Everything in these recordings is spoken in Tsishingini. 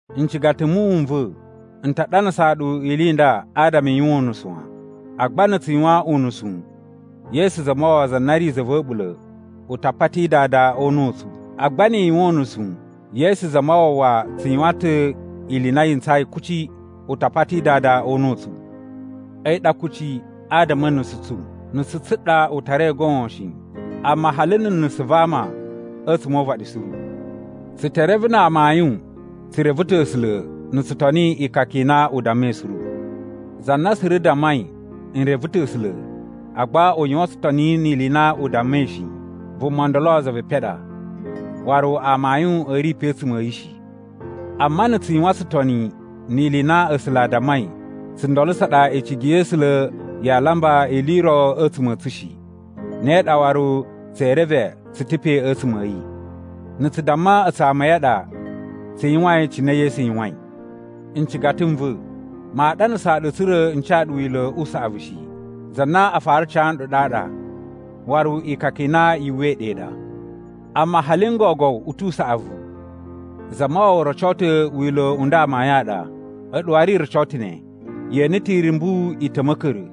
Ncigata m muwun n va̱, n ta ɗanasaa ɗu ili i nda adama i yuwan unusu wan. Agba na̱ tsu yuwan unusu, Yesu Zamawawa za na ri za va̱ a̱ɓula̱, u ta pati Dada o una̱ u tsu. Agba ni i yuwan unusu, Yesu Zamawawa tsu yuwan ta̱ ili i na yi ntsayi kuci, u ta pati Dada o una̱ u tsu. A̱yi ɗa kucci adama a̱ nusu tsu. Nusu tsu ɗa u tarai goon shi, amma hali na̱ nusu va ama a̱tsuma̱ o uvaɗi suru. Tsu te reve na amayun tsu reve ta̱ A̱sula̱ na̱ tsu toni ikaka i na u dammai suru. Za na suru dammai, “N reve ta̱ A̱sula̱,” agba u yuwan tsutoni ni ili i na u dammai shi, vuma ndolo za ve epen ɗa, waru amayun a̱ ri pe a̱tsuma̱ a̱ yi shi. Amma na̱ tsu yuwan tsutoni ni ili i na A̱sula̱ a dammai, tsundolo tsa ɗa icigi ya̱ A̱sula̱ yaa lamba ili i ro a̱tsuma̱ a̱ tsu shi, ne ɗa waru tsee reve tsu ta̱ pe a̱tsuma̱ a̱ yi. Na̱ tsu damma a̱tsu ama a̱ yi a ɗa, tsu yuwain cine Yesu yuwain. Ncigata n va̱, maa ɗanasaa ɗu tsa̱ra̱ n ca ɗu wila̱ u saꞌavu shi. Za na a fara ca nɗu ɗaɗa, waru ikaka i na yu uwwai ɗe ɗa. Amma hali n gogo u tu usaꞌavu. Zamawawa roco ta̱ wila̱ u nda amayun a ɗa, a̱ɗu waru i roco ta̱ ne. Ye ene ta̱ irumbu i ta̱ ma̱ka̱ra̱,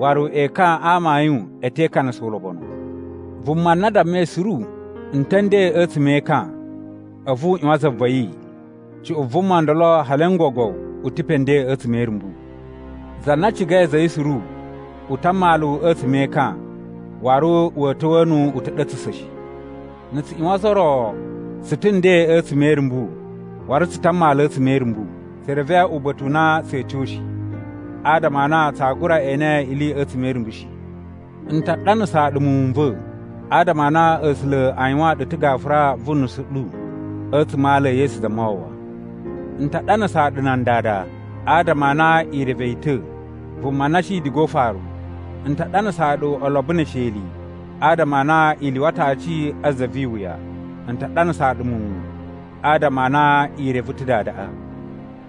waru ekan a amayun a̱ te ikanasa ulobonu. Vuma na dammai suru, “N ta̱ a̱ nden a̱tsuma̱ e ekan,” a̱vu u ꞌyuwan za va̱ yi, cuꞌun vuma ndolo hali n gogo u ta̱ pe nden a̱tsuma̱ e irumbu. Za na cigai a̱za̱ a̱ yi suru u ta a mmalu a̱tsuma̱ e ekan, waru wa̱a̱ ta̱wa̱a̱ nu uta̱ɗa̱tsa̱sa̱ shi. Na̱ tsu ꞌyuwan ozo o ro, tsu ta̱ nden a̱tsuma̱ e irumbu, waru tsu ta̱ a mmalu a̱tsuma̱ e irumbu. Tsu reve uba̱ta̱ u na tsa̱a̱ tyo shi, adama a na tsaa gura ene ili a̱tsuma̱ e irumbu shi. N ta ɗanasaa ɗu muwun n va̱, adama a na A̱sula̱ a yuwaan ɗu ta̱ gafura vu nusu ɗu a̱tsuma̱ a ala e Yesu Zamawawa. N ta ɗanasaa ɗu nan dada, adama a na i reve yi ta̱, vuma na shi diga o ufaru. N ta ɗanasaa ɗu olobo ne esheli, adama a na i lyuwa ta̱ aci a za vi iwuya. N ta ɗanasaa ɗu muwun, adama a na i reve ta̱ Dadaꞌa.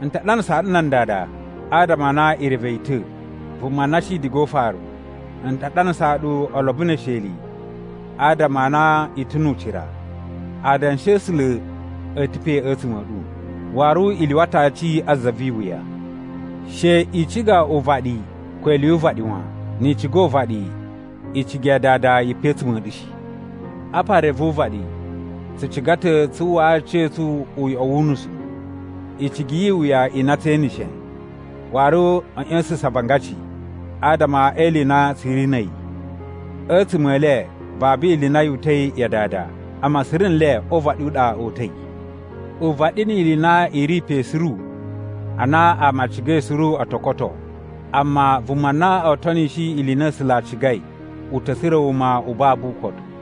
N ta ɗanasaa ɗu nan dada, adama a na i reve yi ta̱, vuma na shi diga o ufaru. N ta ɗanasaa ɗu olobo ne esheli, adama a na i ta̱ nu ucira. Adanshi a̱ A̱sula̱ a̱ ta̱ pe a̱tsuma̱ a̱ ɗu, waru i lyuwa ta̱ aci a za vi iwuya. She i ciga uvaɗi ko ili yu uvaɗi wan. Ni i ciga uvaɗi, icigi ya Dada yi pe a̱tsuma̱ a̱ ɗu shi. Apa re vu uvaɗi: tsu ciga ta̱ tsu uwwaa aciya̱tsu uyoꞌo wu unusu, icigi yi iwuya i na tse eneshe, waru a̱ ꞌya̱sa̱sa̱n avangaci adama e ili i na tsu ri na̱ a̱yi. A̱tsuma̱ e le babu ili i na yu uta̱i ya Dada, amma suru nle o uvaɗi u ɗa o uta̱i. Uvaɗi ni ili i na i ri pe suru a na ama a cigai suru o to koto, amma vuma na o tonishi ili i na A̱sula̱ a cigai u ta̱ tsura̱ wuma u babu ukotu.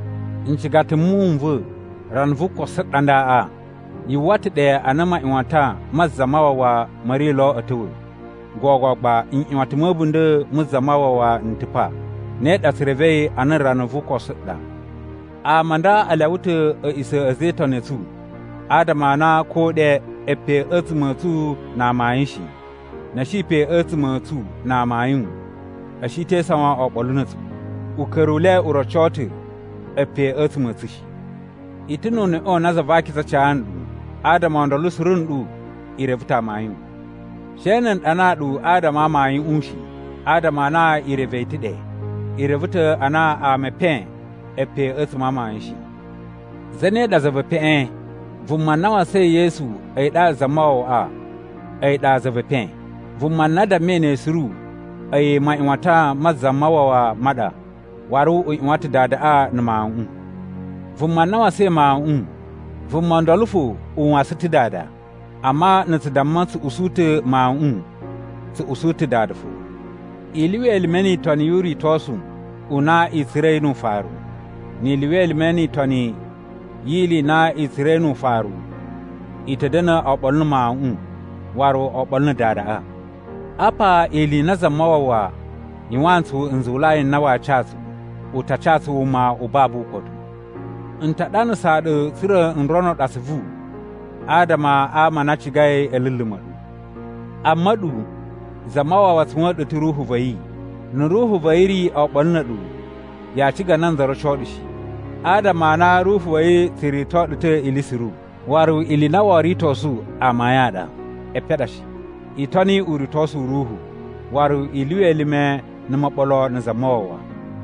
Ncigata m muwun n va̱, rana vu ukosu ɗa ndaꞌa. Yu uwwa ta̱ ɗe a na maꞌyuwatan ma Zamawawa ma̱ ri lo a̱ ta̱wa̱, gogo gba nꞌyuwatan ma̱ a̱bunda̱ mu Zamawawa n ta̱ pa. Ne ɗa tsu revei a na rana vu ukosu ɗa. Ama a nda a lyawa ta̱ a̱ꞌisa̱ a̱ a̱za̱ e Itoni a̱ tsu, adama a na ko ɗe e pe a̱tsuma̱ a̱ tsu na amayun shi. Na̱ a̱ shi pe a̱tsuma̱ a̱ tsu na amayun, a̱ shi te isawan oɓolo na̱ a̱tsu. Uka̱ru u le u roco ta̱ a̱ pe a̱tsuma̱ a̱ tsu shi. I ta̱ nu uneꞌe u na Za va Akiza ca nɗu, adama o ndolo suru nɗu i reve ta̱ amayun. She na̱ n ɗanaa ɗu adama a amayuꞌun shi, adama a na i reve yi ta̱ ɗe. I reve ta̱ a na ama e epen e pe a̱tsuma̱ a amayun shi. Zane ɗa za ve epeꞌen? Vuma na wasain Yesu a̱yi ɗaɗa Zamawawaꞌa, a̱yi ɗa za ve epen. Vuma na dammai ne suru, a̱yi maꞌyuwatan ma Zamawawa ma ɗa, waru u ꞌyuwan ta̱ Dadaꞌa na̱ Mawuꞌun. Vuma na wasain Mawuꞌun, vuma ndolo fo u wasan ta̱ Dada. Amma na̱ tsu damma tsu usu ta̱ Mawuꞌun, tsu usu ta̱ Dada fo. I lyuwa elime ni itoni yu uritosu u na i tsura̱i nu ufaru. Ni i lyuwa elime ni itoni yi ili i na i tsura̱i nu ufaru, i ta̱ da̱na̱ oɓolo na̱ Mawuꞌun waru oɓolo na̱ Dadaꞌa. Apa ili i na Zamawawa yuwaan tsu nzuwulai n na waa ca tsu: u ta ca tsu wuma u babu ukotu. N ta ɗanasaa ɗu tsa̱ra̱ n rono ɗu atsuvu adama ama a na a cigai a̱ luluma̱ ɗu. Amma a̱ɗu, Zamawawa tsuwa̱n ɗu ta̱ Ruhu va̱ yi. Na̱ Ruhu va̱ yi ri oɓolo na̱ a̱ɗu, yaa ciga nanza roco ɗu shi. Adama a na Ruhu va̱ yi tsu rito ɗu ta̱ ili suru, waru ili i na woo ritosu amayun a ɗa, epen a ɗa shi. I toni uritosu u Ruhu, waru i lyuwa elime na̱ moɓolo na̱ Zamawawa.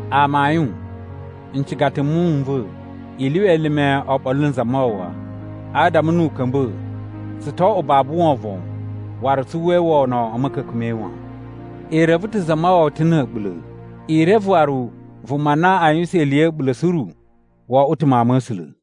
Amayun, ncigata m muwun n va̱, i lyuwa elime oɓolo na̱ Zamawawa, adama nu u ka̱mba̱, tsu to oꞌwo babu wovon waru tsu uwwai wono a̱ ma̱ka̱ka̱n ma̱ yi wan. I reve ta̱ Zamawawa ta̱ na̱ a̱ɓula̱. I reve waru vuma na a yuwusan ili ya̱ a̱ɓula̱ suru wo oꞌwo ta̱ mawun ma̱ A̱sula̱.